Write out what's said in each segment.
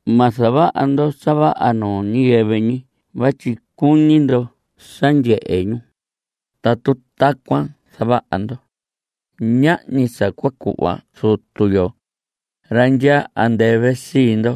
Ma zavaha ndo sa vaha nuu ñiyɨvɨ ñi vatyi cuñi ndo sa ndyehe ñu. Tatu tacuan zavaha ndo, ñahñi sa cua cuhva Zutu yo, ra ndyaa andɨvɨ, sii ndo.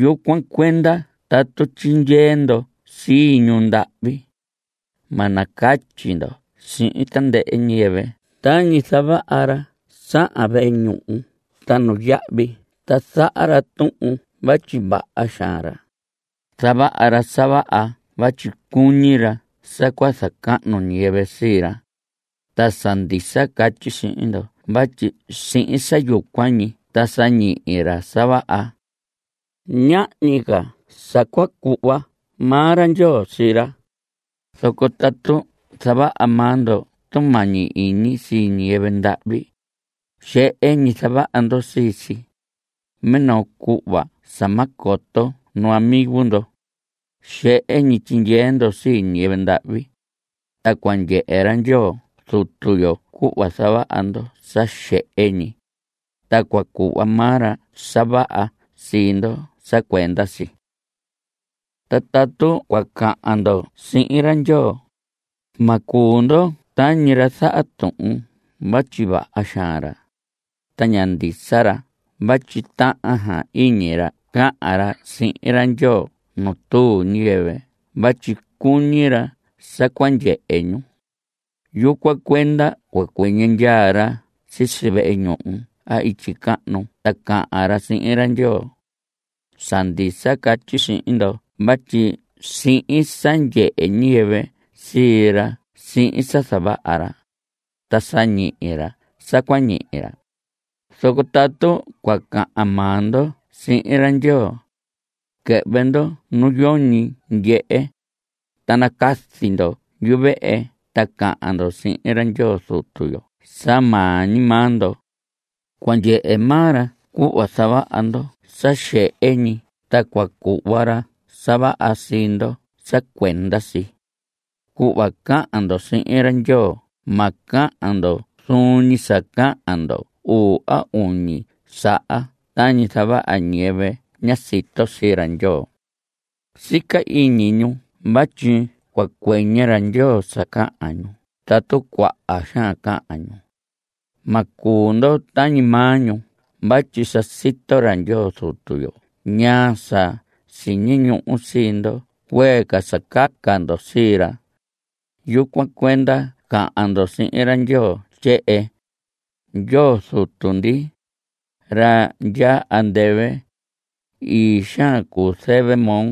Yucuan cuenda tatu tyindyee ndo sii ñu ndahvi, ma nacatyi ndo sihin tandɨhɨ ñiyɨvɨ tañi zavaha ra sahan vehe ñuhu ta nuyahvi ta zaha ra tuhun vatyi vaha xaan ra. Zavaha ra sa vaha vatyi cuñi ra sa cua zacahnu ñiyɨvɨ sii ra. Ta sa ndisa catyi sihin ndo vatyi sihin sa yucuan ñi ta sa ñihi ra sa vaha. Ñahñi ca sa cua cuhva maa ra Ndyoo sii ra. Zoco tatu zavaha maa ndo tumañi iñi sii ñiyɨvɨ ndahvi, xehe ñi zavaha ndo sii si, minoo cuhva sa ma coto nu amigo ndo. Xehe ñi tyindyee ndo sii ñiyɨvɨ ndahvi. Ta cua ndyehe ra Ndyoo Zutu yo cuhva zavaha ndo sa xehe ñi, ta cua cuhva maa ra sa vaha sii ndo sa cuenda si. Ta tatu cua cahan ndo sihin ra Ndyoo, ma cuu ndo tañi ra zaha tuhun vatyi vaha xaan ra, ta ña ndisa ra vatyi tahan iñi ra cahan ra sihin ra Ndyoo nu tuu ñiyɨvɨ vatyi cuñi ra sa cua ndyehe ñu. Yucuan cuenda cua cuɨñɨ ndyaa ra sisi vehe ñuhu a ityi cahnu ta cahan ra sihin ra Ndyoo. Sa ndisa catyi sihin ndo vatyi sihin sa ndyehe ñiyɨvɨ sii ra sihin sa zavaha ra, ta sa ñihi ra sa cua ñihi ra. Zoco tatu cua cahan maa ndo sihin ra Ndyoo, quɨhvɨ ndo nu yoñi ndyehe, ta nacazi ndo yuvehe ta cahan ndo sihin ra Ndyoo Zutu yo sa maa ñi maa ndo. Cua ndyehe maa ra cuhva zavaha ndo sa xehe ñi, ta cua cuhva ra sa vaha sii ndo sa cuenda si. Cuhva cahan ndo sihin ra Ndyoo ma cahan ndo zuun ñi sa cahan ndo uu a uñi saha tañi zavaha ñiyɨvɨ ña sito sii ra Ndyoo. Sica iñi ñu vatyi cua cuɨñɨ ra Ndyoo sa cahan ñu tatu cuaha xaan cahan ñu. Ma cuu ndo tañi maa ñu vatyi sa sito ra Ndyoo Zutu yo ñaa sa siñi ñuhu sii ndo cuee ca sa caca ndo sii ra. Yucuan cuenda cahan ndo sihin ra Ndyoo tyehen: Ndyoo Zutu ndi, ra ndyaa andɨvɨ, ii xaan cuu zɨvɨ moo.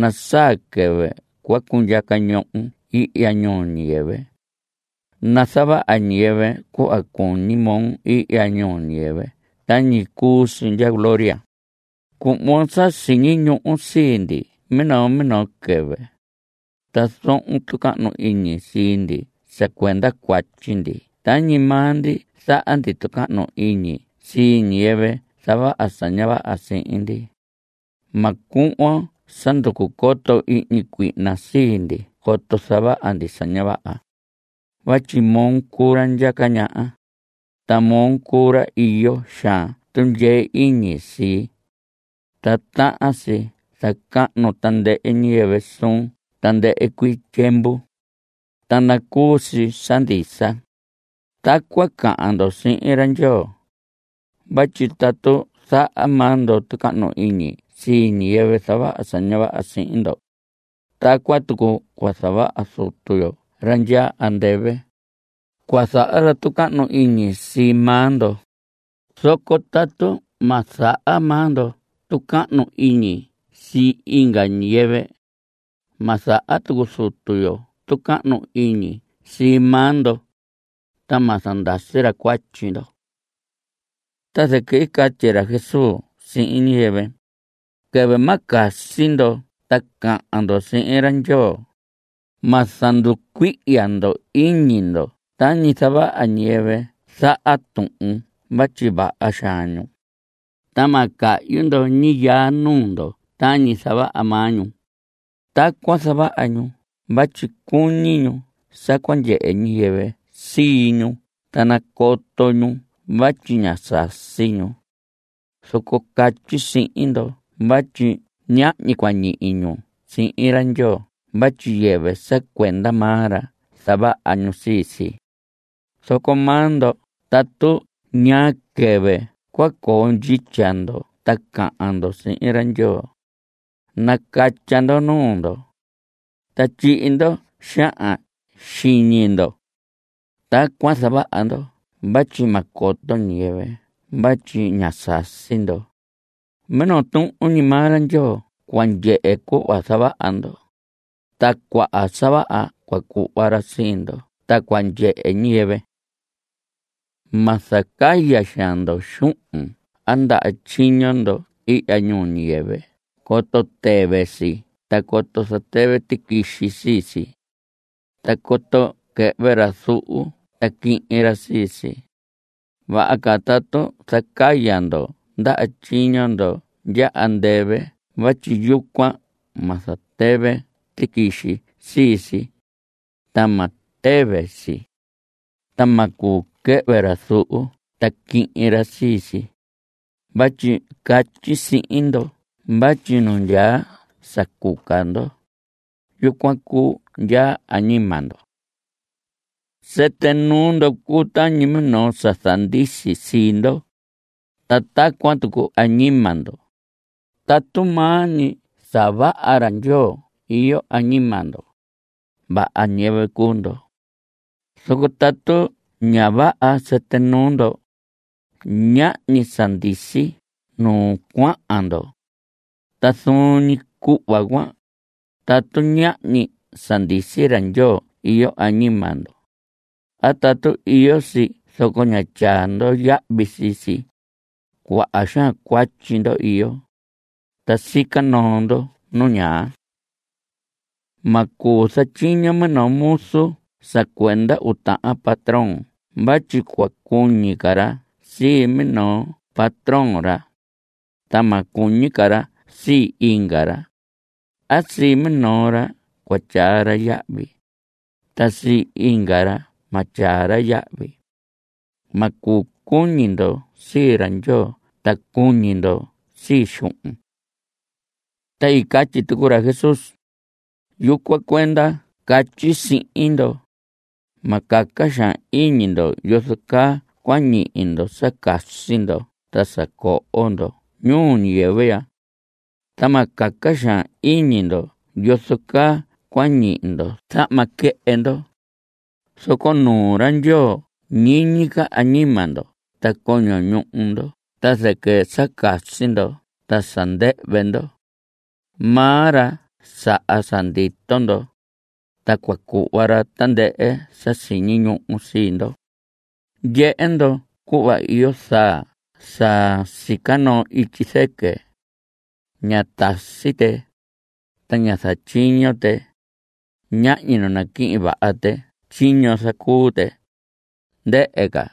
Nasaa quɨvɨ cua cundyaca ñohon ihya ñuu ñiyɨvɨ. Nazavaha ñiyɨvɨ cuhva cuñi moo ihya ñuu ñiyɨvɨ tañi cuu si ndya gloria. Cuhvon sa siñi ñuhu sii ndi minoo minoo quɨvɨ. Ta zohon tucahnu iñi sii ndi sa cuenda cuatyi ndi tañi maa ndi zaha ndi tucahnu iñi sii ñiyɨvɨ zavaha sa ña vaha sihin ndi. Ma cuhvon sa nducu coto ihñi cuihna sii ndi coto zavaha ndi sa ña vaha. Vatyi moo cuu ra ndyaca ñaha, ta moo cuu ra iyo xaan tundyee iñi sii, ta tahan si zacahnu tandɨhɨ ñiyɨvɨ suun tandɨhɨ cuii tyiemvu. Ta nacuu si sa ndisa. Tacuan cahan ndo sihin ra Ndyoo. Vatyi tatu zaha maa ndo tucahnu iñi sii ñiyɨvɨ zavaha sa ña vaha sihin ndo, tacuan tucu cua zavaha Zutu yo ra ndyaa andɨvɨ. Cua zaha ra tucahnu iñi sii maa ndo. Zoco tatu ma zaha maa ndo tucahnu iñi sii inga ñiyɨvɨ, ma zaha tucu Zutu yo tucahnu iñi sii maa ndo, ta ma zandasi ra cuatyi ndo. Ta zɨquɨ i catyi ra Jesús sihin ñiyɨvɨ: Quɨvɨ ma casi ndo ta cahan ndo sihin ra Ndyoo, ma zanducuihya ndo iñi ndo tañi zavaha ñiyɨvɨ zaha tuhun vatyi vaha xaan ñu. Ta ma cahyi ndo ñiyaa nuu ndo tañi zavaha maa ñu. Tacuan zavaha ñu vatyi cuñi ñu sa cua ndyehe ñiyɨvɨ sii ñu ta nacoto ñu vatyi ña sasi ñu. Zoco catyi sihin ndo vatyi ñahñi cua ñihi ñu sihin ra Ndyoo vatyi yɨvɨ sa cuenda maa ra zavaha ñu sii si. Zoco maa ndo tatu ñaa quɨvɨ cua coo ndyitya ndo ta cahan ndo sihin ra ndyoo, nacatya ndo nuu ndo, ta tyihi ndo xahan xiñi ndo. Tacuan zavaha ndo vatyi ma coto ñiyɨvɨ vatyi ñá sasi ndo. Minoo tuhun ñi maa ra Ndyoo cua ndyehe cuhva zavaha ndo, ta cuaha sa vaha cua cuhva ra sii ndo ta cua ndyehe ñiyɨvɨ. Ma zacaya xaan ndo xuhun a ndaha tyiño ndo ihya ñuu ñiyɨvɨ coto tɨvɨ si a coto zatɨvɨ tiquixi sii si. Ta coto quɨhvɨ ra zuhu ta quihin ra sii si. Vaha ca tatu zacaya ndo ndaha tyiño ndo ndya andɨvɨ vatyi yucuan ma zatɨvɨ tiquixi sii si. Ta ma tɨvɨ si. Ta ma cuu quɨhvɨ ra zuhu ta quihin ra sii si. Vatyi catyi sihin ndo vatyi nu ndyaa sa cuca ndo, yucuan cuu nu ndyaa añima ndo. Sɨtɨ nuu ndo cuu tañi minoo sa zandisi sii ndo. Ta tacuan tucu añima ndo, tatu maa ñi sa vaha ra Ndyoo iyo añima ndo, vaha ñiyɨvɨ cuu ndo. Zoco tatu ña vaha sɨtɨ nuu ndo, ñahñi sa zandisi nu cuahan ndo. Ta zuun ñi cuhva cuan, tatu ñahñi sa ndisi ra Ndyoo iyo añima ndo, a tatu iyo si zoco ña tyaa ndo yahvi sii si, cuaha xaan cuatyi ndo iyo, ta sica noo ndo nu ñaa. Ma cuu zatyiño minoo muzu sa cuenda uu tahan patrón vatyi cua cuñi ca ra sii minoo patrón ra, ta ma cuñi ca ra sii inga ra. A sii minoo ra cua tyaa ra yahvi, ta sii inga ra ma tyaa ra yahvi. Ma cuu cuñi ndo sii ra Ndyoo ta cuñi ndo sii xuhun. Ta i catyi tucu ra Jesús: Yucuan cuenda catyi sihin ndo, ma caca xaan iñi ndo yozo caa cua ñihi ndo sa casi ndo ta sa coho ndo ñuu ñiyɨvɨ ya. Ta ma caca xaan iñi ndo yozo caa cua ñihi ndo zahma quɨhɨ ndo. Zoco nuu ra Ndyoo ñiñi ca añima ndo ta coño ñuhu ndo ta zɨquɨ sa casi ndo ta sa ndɨhvɨ ndo. Maa ra saha sa ndito ndo, ta cua cuhva ra tandɨhɨ sa siñi ñuhu sii ndo. Ndyehe ndo cuhva iyo zaa sa sica noo ityi zɨquɨ. Ña tasi tɨ. Ña zatyiño tɨ. Ñahñi nu naquihin vaha tɨ tyiño zacuu tɨ, ndɨhɨ ca.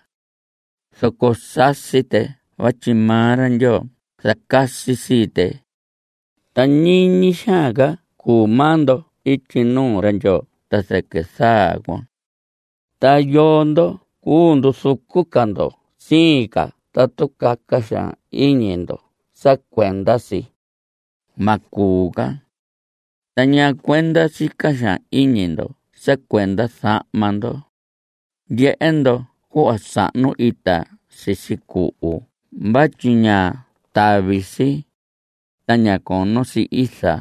Zoco sasi tɨ vatyi maa ra Ndyoo zacasi sii tɨ. Ta ñiñi xaan ca cuu maa ndo ityi nuu ra Ndyoo ta zɨquɨ zaa cuan. ¿Ta yoo ndo cuu nduzucu ca ndo siin ca tatu caca xaan iñi ndo sa cuenda si? Ma cuu ca. ¿Ta ñaa cuenda sica xaan iñi ndo sa cuenda zahma ndo? Ndyehe ndo cuhva sahnu ita sisi cuhu vatyi ña tavi si, ta ña cono si iza.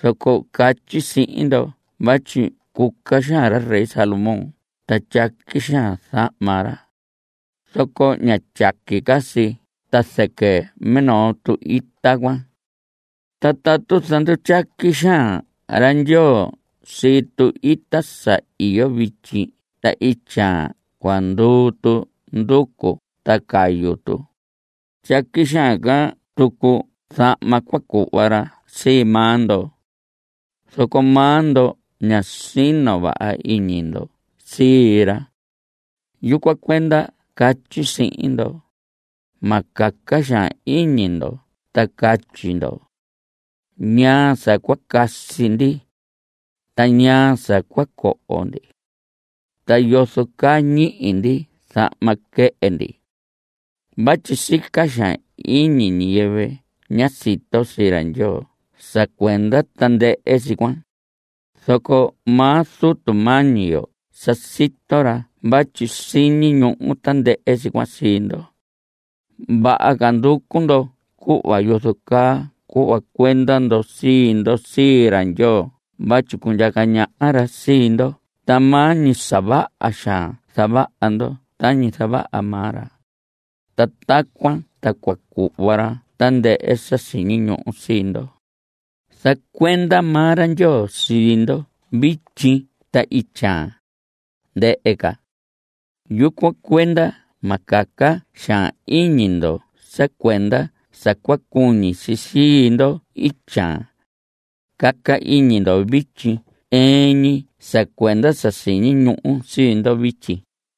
Zoco catyi sihin ndo vatyi cuca xaan ra rey Salomón ta tyaqui xaan zahma ra, zoco ña tyaqui ca si ta zɨquɨ minoo ita cuan. Ta tatu zandutyaqui xaan ra Ndyoo sii tu‑ita sa iyo vityi ta ityaan cua nduu tu nducu ta cayu tu, tyaqui xaan tucu zahma cua cuhva ra sii maa ndo. Zoco maa ndo ña sino vaha iñi ndo sii ra. Yucuan cuenda catyi sihin ndo: Ma caca xaan iñi ndo ta catyi ndo: “¿Ñaa sa cua casi ndi? ta ¿naa sa cua coho ndi? ta ¿yozo caa ñihi ndi zahma quɨhɨ ndi?” Vatyi sica xaan iñi ñiyɨvɨ ña sito sii ra Ndyoo sa cuenda tandɨhɨ si cuan. Zoco maa Zutu mañi yo sa sito ra vatyi siñi ñuhu tandɨhɨ si cuan sii ndo. Vaha ca nducu ndo cuhva yozo caa cua cuhva cuenda ndo sii ndo sii ra Ndyoo vatyi cundyaca ñaha ra sii ndo ta maa ñi sa vaha xaan zavaha ndo tañi zavaha maa ra, ta tacuan ta cua cuhva ra tandɨhɨ sa siñi ñuhu sii ndo. Zacuenda maa ra Ndyoo sii ndo vityi ta ityaan, ndɨhɨ ca. Yucuan cuenda ma caca xaan iñi ndo sa cuenda sa cua cuñi si sii ndo ityaan. Caca iñi ndo vityi ɨɨn ñi sa cuenda sa siñi ñuhu sii ndo vityi.